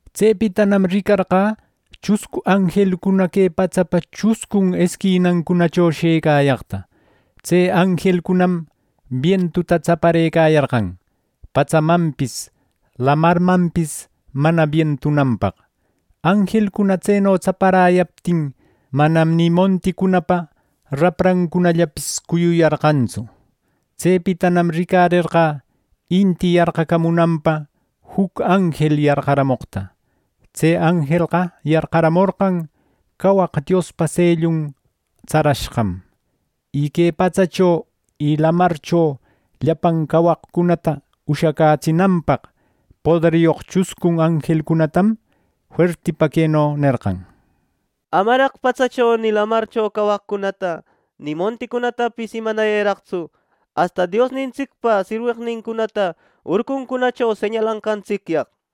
Tsepitanam ricarqä chuscu anjelcuna que patsapa chuscun esquinancunacho shëcayaqta. Tse anjelcunam bientuta tsaparëcayarqan patsamanpis lamarmanpis mana bientunanpaq. Anjelcuna tseno tsaparäyaptin manam ni monticunapa raprancunallapis cuyuyarqantsu. Tsepitanam ricarerqä inti yarqacamunanpa juc anjel yarqaramoqta. Tse anjelqa yarqaramorqan cawaq Diospa sellun tsarashqam. Y que patsacho y lamarcho llapan cawaqcunata ushacätsinanpaq, poderyoq chuscun anjelcunatam fuertipa queno nerqan: “Amaraq patsacho, ni lamarcho cawaqcunata, ni monticunatapis imanayëraqtsu asta Diosnintsicpa sirweqnincunata urcuncunacho señalanqantsicyaq” nir.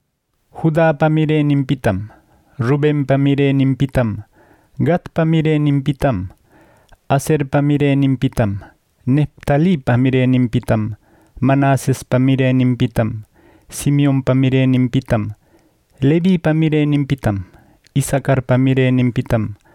Judapa mireninpitam, Rubenpa mireninpitam, Gadpa mireninpitam, Aserpa mireninpitam, Neftalipa mireninpitam, Manasespa mireninpitam, Simeonpa mireninpitam, Levipa mireninpitam, Isacarpa mireninpitam,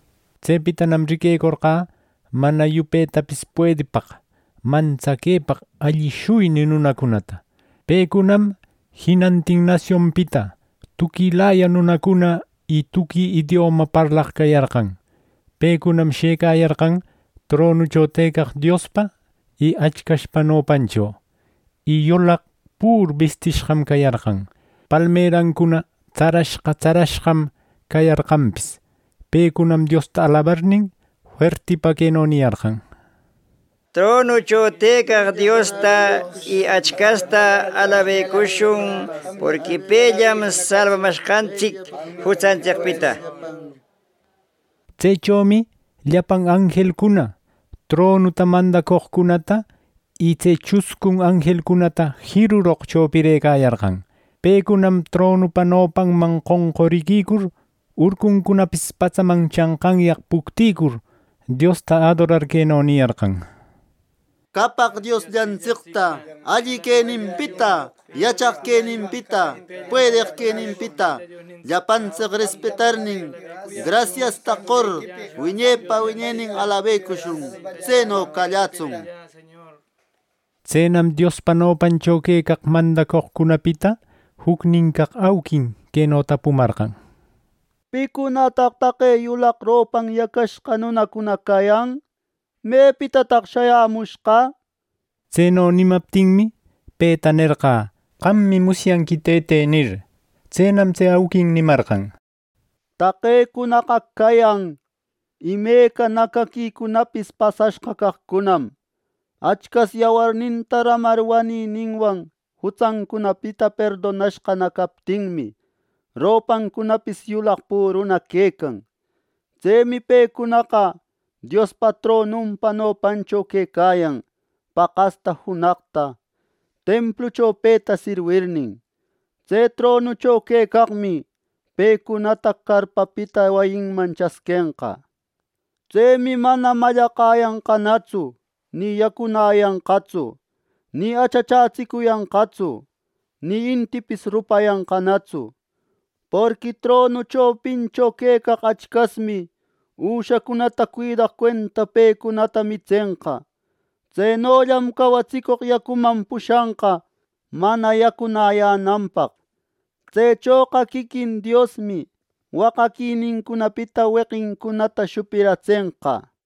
Tsepitanam riquecorqä mana yupetapis puedipaq, mantsaquepaq alli shuyni nunacunata. Pecunam jinantin nasionpita tuquilaya nunacuna y tuqui idioma parlaq cayarqan. Pecunam shëcayarqan tronucho tëcaq Diospa y Achcaspa nopancho, y yulaq püru bistishqam cayarqan. Palmerancuna tsarashqa tsarashqam cayarqanpis. Pecunam Diosta alabarnin, fuertipa queno niyarqan: “¡Tronucho tëcaq Diosta y Achcasta alabashun, porqui pellam salbamashqantsic jutsantsicpita!” nir. Tsechomi llapan anjelcuna, tronuta, mandacoqcunata y tse chuscun anjelcunata jiruroq chopirëcayarqan. Pecunam tronupa nopanman qonquriquicur, urcuncunapis patsaman chanqanyaq puctïcur, Diosta adorar, queno niyarqan: “¡Qapaq Diosllantsicta, alli queninpita, yachaq queninpita, puedeq queninpita! ¡Llapantsic respetarnin, grasiasta qor, wiñepa wiñenin alabecushun! ¡Tseno callätsun!” nir. Tsenam Diospa nopancho quecaq mandacoqcunapita jucnin caq auquin queno tapumarqan: “¿Picunataq taqe yulaq ropan yacashqa nunacuna cayan? ¿Mepitataq shayämushqa?” nir. Tseno nimaptinmi, peta nerqä: “Qammi musyanqui, tëte” nir. Tsenam tse auquin nimarqan: “Taqecunaqa cayan imeca nacaquicunatapis pasashqa caqcunam. Achcas yawarninta ramar wanininwan jutsancunapita perdonashqana captinmi, ropancunapis yulaq püruna quecan. Tsemi pecunaqa Diospa tronunpa nopancho quecayan paqasta junaqta templuncho, peta sirwirnin. Tse tronucho tëcaqmi pecunata carpapita wayinman chasquenqa. Tsemi mana mallaqayanqanatsu, ni yacunäyanqatsu, ni achachatsicuyanqatsu, ni intipis rupayanqanatsu; porqui tronu chopincho quecaq Achcasmi üshacunata cuidaq cuenta pecunata mitsenqa. Tsenollam cawatsicoq yacuman pushanqa mana yacunäyänanpaq. Tsechoqa quiquin Diosmi waqaquinincunapita weqincunata shupiratsenqa” nir.